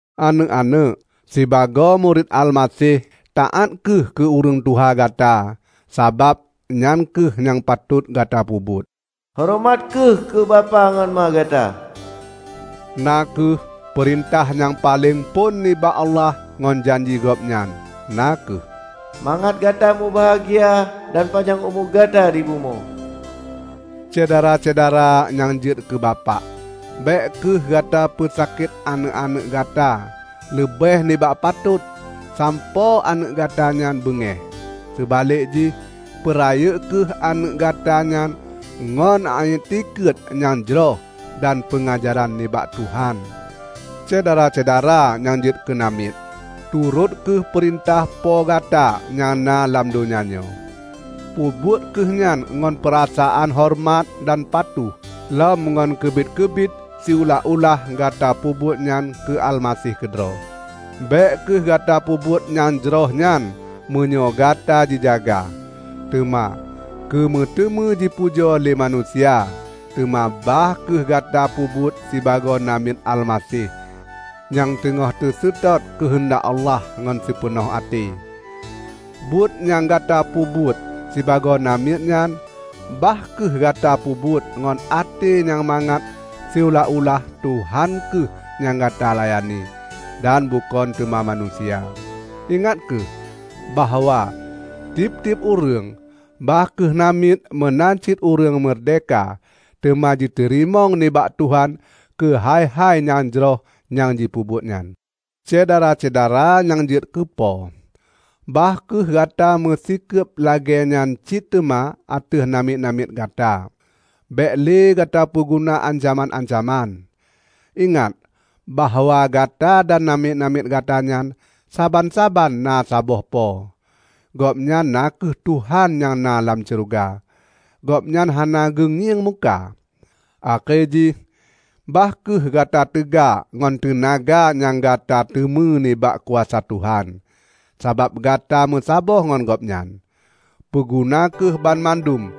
Aneuëk-aneuëk! Sibagoe murit Almaseh, taát kheueh keu ureuëng tuha gata, sabab nyang kheueh nyang patot gata peubuet. "Horeumat kheueh keu bapak ngon ma gata" na kheueh peurintah nyang paleng phon nibak Allah ngon janji Gobnyan, na kheueh: "Mangat gata mubahgia dan panyang umu gata di bumoe". Syedara-syedara nyang jeuet keu bapak! Bék kheueh gata peusakét aneuëk-aneuëk gata leubeh nibak patot sampoe aneuëk gata nyan beungéh. Seubalek jih, peurayeuk kheueh aneuëk gata nyan ngon iétikeuet nyang jroh dan peungajaran nibak Tuhan. Syedara-syedara nyang jeuet keunamiet! Turot kheueh peurintah po gata nyang na lam donya nyoe. Peubuet kheueh nyan ngon peurasaan horeumat dan patuh lom ngon keubiet-keubiet siulah-ulah gata peubuet nyan keu Almaseh keudroe. Bék kheueh gata peubuet nyang jroh nyan meunyoe gata jijaga, teuma keumeuteumé jipujoe lé manusia. Teuma bah kheueh gata peubuet sibagoe namiet Almaseh nyang teungoh teuseutôt keuheundak Allah ngon sipeunoh até. Buet nyang gata peubuet sibagoe namiet nyan, bah kheueh gata peubuet ngon até nyang mangat siulah-ulah Tuhan kheueh nyang gata layani, dan bukon teuma manusia. Ingat kheueh bahwa tieb-tieb ureuëng, bah kheueh namiet meunan cit ureuëng meurdehka, teuma jiteurimong nibak Tuhan keuhai-hai nyang jroh nyang jipeubuet nyan. Syedara-syedara nyang jeuet keu po! Bah kheueh gata meusikeub lagée nyan cit teuma ateueh namiet-namiet gata. Bék lé gata peuguna ancaman-ancaman. Ingat bahwa gata dan namiet-namiet gata nyan, saban-saban na saboh po, Gobnyan na kheueh Tuhan nyang na lam syeuruga. Gobnyan hana geungieng muka. Akhé jih, bah kheueh gata teuga ngon teunaga nyang gata teumé nibak kuasa Tuhan, sabab gata meusaboh ngon Gobnyan. Peuguna kheueh banmandum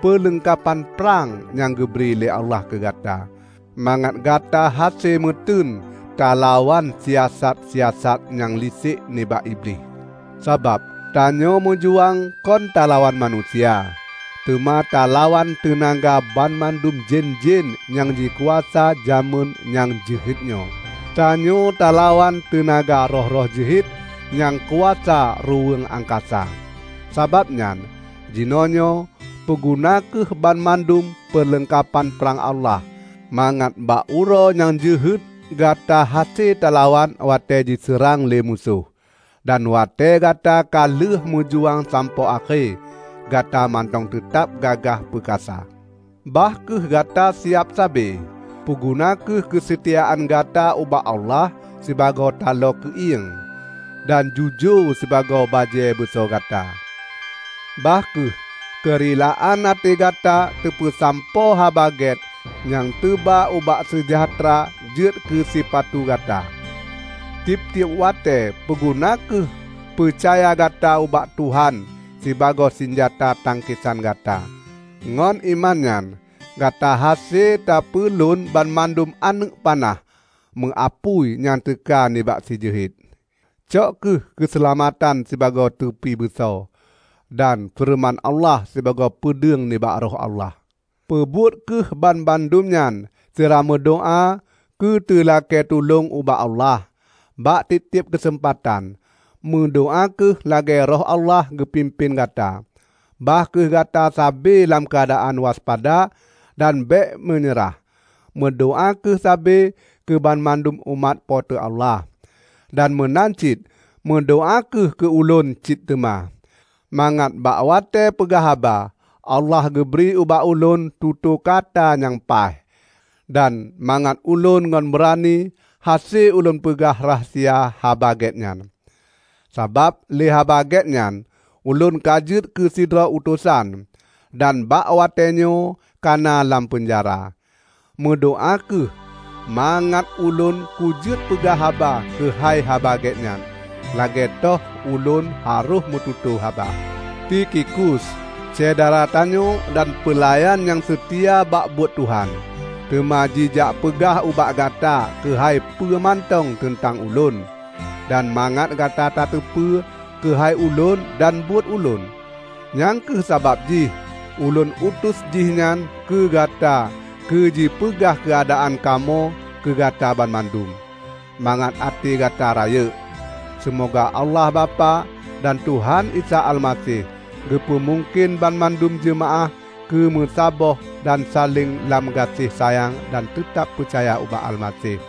peuleungkapan prang nyang geubri lé Allah keugata, mangat gata hase meuteun talawan siasat-siasat nyang lisek nibak Iblih. Sabab tanyoe meujuang kon talawan manusia, teuma talawan teunaga banmandum jén-jén nyang jikuasa jamén nyang jeuhet nyoe. Tanyoe talawan teunaga roh-roh jeuhet nyang kuasa ruweueng angkasa. Sabab nyan, jinoenyoe, peuguna kheueh banmandum peuleungkapan prang Allah, mangat bak uroe nyang jeuhet gata hase talawan watée jiseurang lé musoh. Dan watée gata ka lheueh meujuang sampoe akhé, gata mantong teutab gagah peukasa. Bah kheueh gata siab sabe. Peuguna kheueh keuseutiaan gata ubak Allah sibagoe taloe keuieng, dan jujoe sibagoe bajée beuso gata. Bah kheueh keurilaan até gata tapeusampoe Haba Gét nyang teuba ubak seujahteura jeuet keusipatu gata. Tieb-tieb watée peuguna kheueh peucaya gata ubak Tuhan sibagoe sinjata tangkesan gata; ngon iman nyan gata hase tapeulon banmandum aneuëk panah meuapui nyang teuka nibak sijeuhet. Cok kheueh keuseulamatan sibagoe tupi beuso, dan feureuman Allah sibagoe peudeueng nibak Roh Allah. Peubuet kheueh banmandum nyan sira meudoá keuteulakée tulông ubak Allah. Bak tieb-tieb keuseumpatan, meudoá kheueh lagée Roh Allah geupimpén gata. Bah kheueh gata sabe lam keuadaan waspada dan bék meunyeurah. Meudoá kheueh sabe keubanmandum umat Po teu Allah. Dan meunan cit meudoá kheueh keu ulôn cit teuma, mangat bak watée peugah haba, Allah geubri ubak ulôn tutoe kata nyang paih. Dan mangat ulôn ngon beurani hase ulôn peugah rahsia Haba Gét nyan. Sabab lé Haba Gét nyan, ulôn ka jeuet keusidroe utosan, dan bak watée nyoe kana lam peunjara. Meudoá kheueh mangat ulôn kujeuet peugah haba keuhai Haba Gét nyan, lagée toh ulôn harôh meututoe haba. Tikhikus, syedara tanyoe dan peulayan nyang seutia bak buet Tuhan, teuma jijak peugah ubak gata keuhai peue mantong teuntang ulôn, dan mangat gata tateupeue keuhai ulôn dan buet ulôn. Nyang kheueh sabab jih ulôn utus jihnyan keugata keujipeugah keuadaan kamoe keugata banmandum, mangat até gata rayeuk. Seumoga Allah Bapak, dan Tuhan Isa Almaseh geupeumungken banmandum jeumaáh keu meusaboh dan saléng lam gaséh sayang dan teutab peucaya ubak Almaseh.